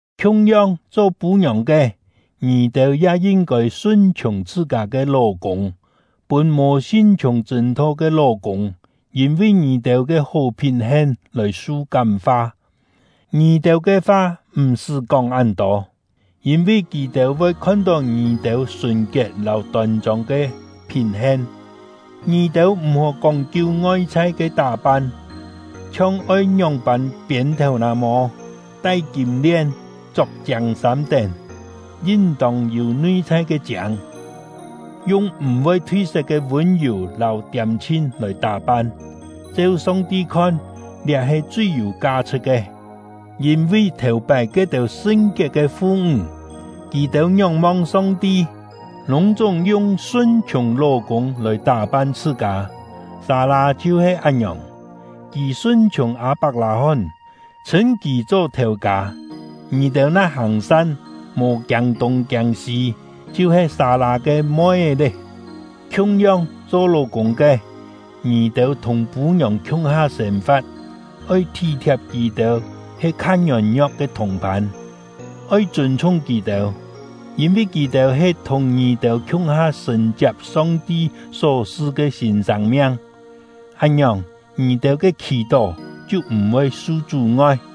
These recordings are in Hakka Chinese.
Khiung-yong, cho pû-ngiòng ke, ngì-têu ya yin-kôi sun-chhiùng chhṳ-kâ ke ló-kûng, pûn mò sin-chhiùng chṳ̂n-tho ke ló-kûng yîn-vi ngì-têu ke hó phín-hen lòi su kám-fa. Ngì-têu ke fa m̀-sṳ́ kóng án-tô, yîn-vi kì-têu voi khon-tó ngì-têu sùn-kiet lâu tôn-chông ke phín-hen. Ngì-têu m̀-hó kóng-kiu ngoi-chhai ke tá-pan, chhiong oi ngióng-pân piên thèu-nà-mô, tai kîm-lien, chok chiâng sâm tén. Yin-tông yû nui-chhai ke chiâng, yung m̀-voi thui-set ke vûn-yù lâu tiâm-chhin lòi tá-pan; cheu Song-ti khon, liá he chui yû ka-chhṳ̍t ke. Yîn-vi, thèu-pái ke-têu sṳn-kiet ke fu-ńg, kì-têu ngióng-mong Song-ti, lûng-chúng yung sun-chhiùng ló-kûng lòi tá-pan chhṳ-kâ. Sâ-lâ chhiu-he án-ngiòng; kì sun-chhiùng Â-pak-lâ-hón, chhṳ̂n kì cho “Thèu-kâ”. Ngì-têu na hàng-san, mò kiâng tûng kiâng sî, chhiu-he Sâ-lâ ke moi-é lé. Khiung-yong, cho ló-kûng ke, ngì-têu thùng pû-ngiòng khiung-ha sên-fa̍t, oi thí-thiap kì-têu he kha ngiôn-ngio̍k ke thùng-phân. Oi chûn-chhung kì-têu, yîn-vi kì-têu he thùng ngì-têu khiung-ha sṳ̀n-chiap Song-ti só su ke sîn sâng-miang. Án-ngiòng, ngì-têu ke khì-tó chhiu m̀-voi su chú-ngoi.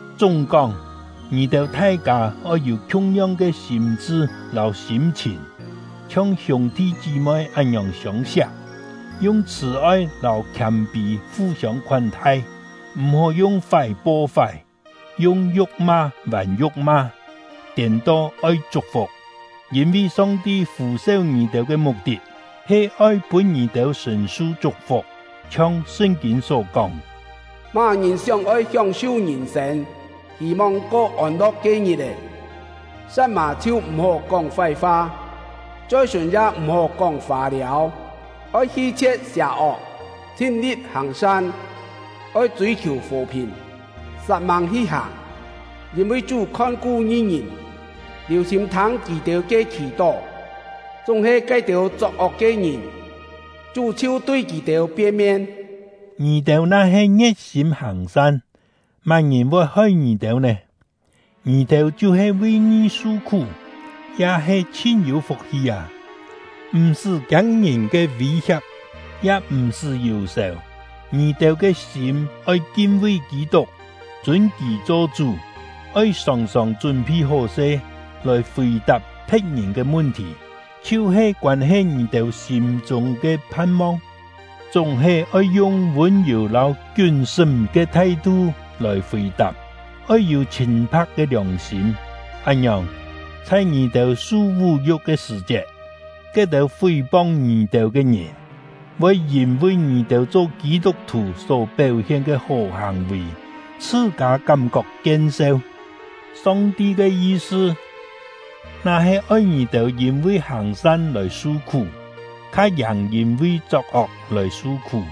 Chúng-kóng, ngì-têu thai-kâ oi yû khiung-yong ke sîm-chṳ lâu sîm-chhìn, chhiong hiûng-thi chí-moi án-ngiòng siông-siak, yung chhṳ̀-oi lâu khiâm-pî fu-siông khoán-thai. M̀-hó yung fái po fái, yung yu̍k-ma vàn yu̍k-ma; tiên-to, oi chuk-fuk, yîn-vi Song-ti fû-seu ngì-têu ke muk-tit he oi pûn ngì-têu sṳ̀n-su chuk-fuk. Chhiong Sṳn-kîn só kóng: Má-ngìn sióng-oi hióng-su ngìn-sên, hî-mong ko ôn-lo̍k ke ngit-è, sa̍t-mà chhiu m̀-hó kóng fái-fa, choi-sùn ya m̀-hó kóng fâ-liâu. Oi hi-chhie̍t sià-ok, chhin-li̍t hàng-san; oi chûi-khiù fò-phìn, sat-mâng hi hàng. Yîn-vi Chú khon-ku ngi-ngìn, liù-sîm thâng kì-têu ke khì-tó; chúng-he ke-têu chok-ok ke ngìn, Chú chhiu tui kì-têu pien-mien. Ngì-têu na-he ngie̍t-sîm hàng-san, má-ngìn voi hoi ngì-têu nè? Ngì-têu chhiu-he vi ngi su-khú, ya he chhin yû fuk-hi â! M̀-sṳ́ kiâng ngìn ke vî-hia̍p, ya m̀-sṳ́ yù-sèu. Ngì-têu ke sîm oi kin-vi Kî-tuk, chûn kì cho Chú. Oi sòng-sòng chún-phi hó-se, lòi fì-tap phe̍t-ngìn ke mun-thì, chhiu-he koân-he ngì-têu sîm-chûng ke phan-mong; chúng-he oi yung vûn-yù lâu kiún-sṳ́m ke thai-thu lòi fì-tap. Oi yû chhîn-pha̍k ke liòng-sîm; án-ngiòng, chhai ngì-têu su vú-yu̍k ke sṳ̀-chiet, ke-têu fí-pong ngì-têu ke ngìn, voi yîn-vi ngì-têu cho Kî-tuk-thù só péu-hien ke hó hàng-vì, chhṳ-kâ kám-kok kien-seu. Song-ti ke yi-sṳ, na-he oi ngì-têu yîn-vi hàng-san lòi su-khú, kha-yàng yîn-vi chok-ok lòi su-khú.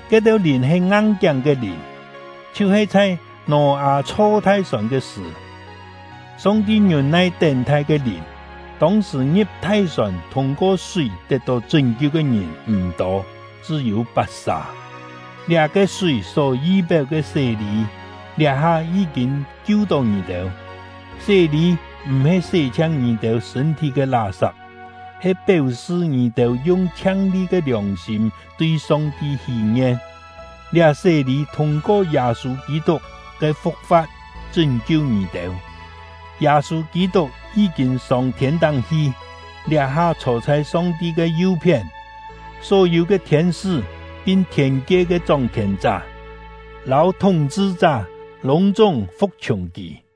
Ke-têu lìn he ngang-kiáng ke lìn, chhiu-he chhai Nò-â chho thai-sòn ke sṳ̀, Song-ti ngiûn-nai tén-thai ke lìn. Tông-sṳ̀, ngi̍p thai-sòn thûng-ko súi tet-tó chṳ́n-kiu ke ngìn m̀ tô, chṳ́-yû pat-sà. Liá-ke súi só yi-péu ke sé-lî, liá-ha yí-kîn kiu-tó ngì-têu. Sé-lî m̀-he sé-chhiang ngì-têu sṳ̂n-thí ke lá-sap, he péu-sṳ ngì-têu yung chhiang-li ke liòng-sîm tui Song-ti hí-ngien; liá sé-lî thûng-ko Yâ-sû Kî-tuk ke fu̍k-fa̍t chṳ́n-kiu ngì-têu. Yâ-sû Kî-tuk yí-kîn sông thiên-táng hi, liá-ha chhô chhai Song-ti ke yu-phién; só-yû ke thiên-sṳ́ pin thiên-kie ke chóng-khièn-chá lâu thúng-chhṳ-chá lûng-chúng fu̍k-chhiùng kì.